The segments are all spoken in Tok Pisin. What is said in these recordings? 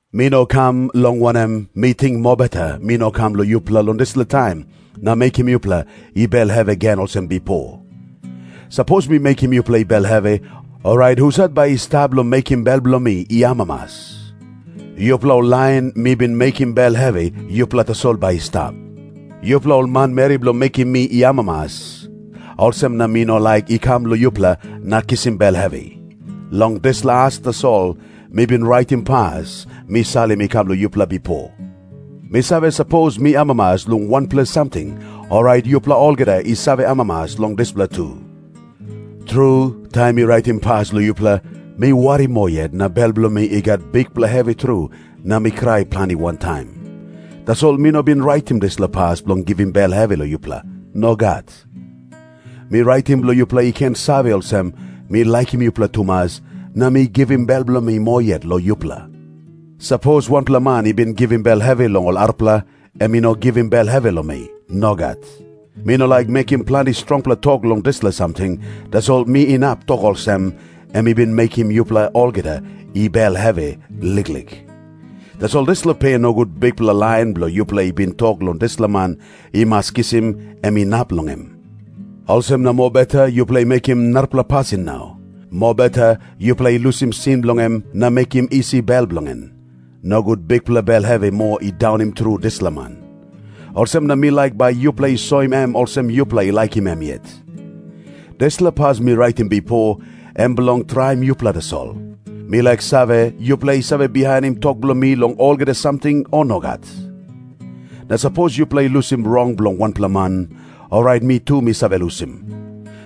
Mi no kam, long wanem, mi ting mobeta mi no kam long yupela long dispela taim na mekim yupela i bel hevi gen olsem bipo. Sapos mi mekim yupela i bel hevi, orait husat bai i stap bilong mekim bel bilong mi i amamas? Yupela ol lain mi bin mekim bel hevi, yupela tasol bai i stap. Yupela ol manmeri bilong mekim mi i amamas, olsem na mi no laik i kam long yupela na kisim bel hevi. Long dispela as tasol mi bin raitim pas mi salim i kam long yupela bipo. Mi save, sapos mi amamas long wanpela samting, orait yupela olgeta i save amamas long dispela tu. Tru, taim mi raitim pas long yupela, mi wari moa yet na bel bilong mi i gat bikpela hevi tru na mi krai planti wantaim. Tasol mi no bin raitim dispela pas bilong givim bel hevi long yupela. Nogat. Mi raitim bilong yupela i ken save olsem, mi laikim yupela tumas na mi givim bel bilong mi moa yet long yupela. Sapos wanpela man i bin givim bel hevi long ol arapela, em i no givim bel hevi long mi. Nogat. Mi no laik mekim planti strongpela tok long dispela samting, tasol mi inap tok olsem, em i bin mekim yupela olgeta i bel hevi liklik. Tasol dispela pe nogut bikpela lain bilong yupela i bin tok long dispela man i mas kisim, em inap long em. Olsem na mobeta yupela i mekim narapela pasin nau. Mobeta yupela i lusim sin bilong em na mekim isi bel bilong en. Nogut bikpela bel hevi moa i daunim tru dispela man. Olsem na mi laik bai yupela i soim em olsem yupela i laikim em yet. Dispela pas mi raitim bipo, em bilong traim yupela tasol. Mi laik save, yupela i save bihainim tok bilong mi long olgeta samting, o nogat? Na sapos yupela i lusim rong bilong wanpela man, orait mi tu mi save lusim.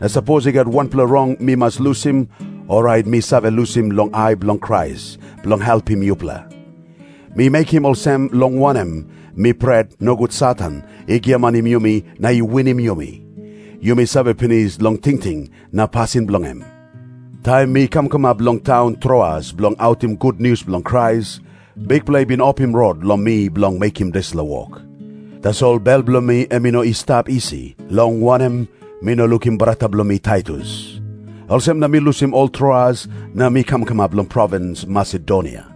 Na sapos i gat wanpela rong mi mas lusim, orait mi save lusim long ai bilong Krais, bilong helpim yupela. Mi mekim olsem, long wanem, mi pret, nogut Satan i giamanim yumi na i winim yumi. Yumi save pinis long tingting na pasin bilong em. Taim mi kam kamap long taun Troas bilong autim gutnius bilong Krais, Bikpela i bin opim rot long mi bilong mekim dispela wok. Tasol bel bilong mi em i no i stap isi. Long wanem, mi no lukim brata bilong mi Taitus. Olsem na mi lusim ol Troas na mi kam kamap long provins Masedonia.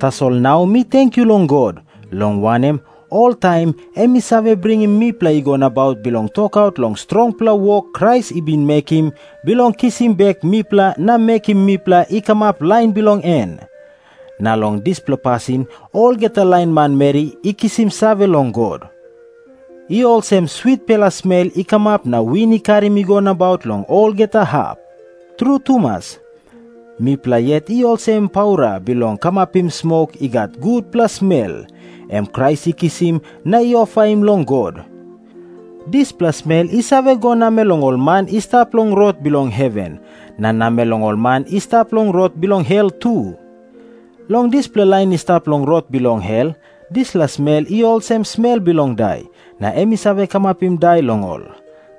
Tasol nau mi tenkyu long God, long wanem, oltaim em i save bringim mipela i go nabaut bilong tokaut long strongpela wok Krais i bin mekim bilong kisim bek mipela na mekim mipela i kamap lain bilong en. Na long dispela pasin olgeta lain manmeri i kisim save long God. I olsem switpela smel i kamap na win i karim i go nabaut long olgeta hap. Tru tumas, mipela yet i olsem paura bilong kamapim smok i gat gutpela smel, em Krais i kisim na i ofaim long God. Dispela smel i save go namel long ol man i stap long rot bilong heven, na namel long ol man i stap long rot bilong hel tu. Long dispela lain i stap long rot bilong hel, dispela smel i olsem smel bilong dai, na em i save kamapim dai long ol.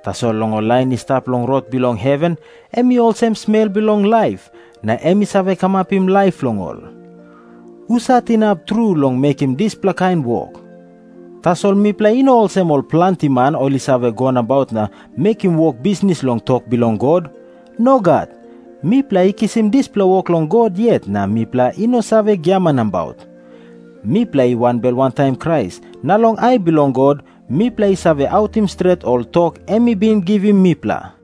Tasol long lain i stap long rot bilong heven em i olsem smel bilong laip, na em i save kamapim laip long ol. Husat inap tru long mekim dispela kain wok? Tasol mipela i no olsem ol planti man, ol i save go nabaut na mekim wok bisnis long tok bilong God. Nogat. Mipela i kisim dispela wok long God yet na mipela i no save giaman nabaut. Mipela i wanbel wantaim Krais, na long ai bilong God mipela i save autim stret ol tok em i bin givim mipela.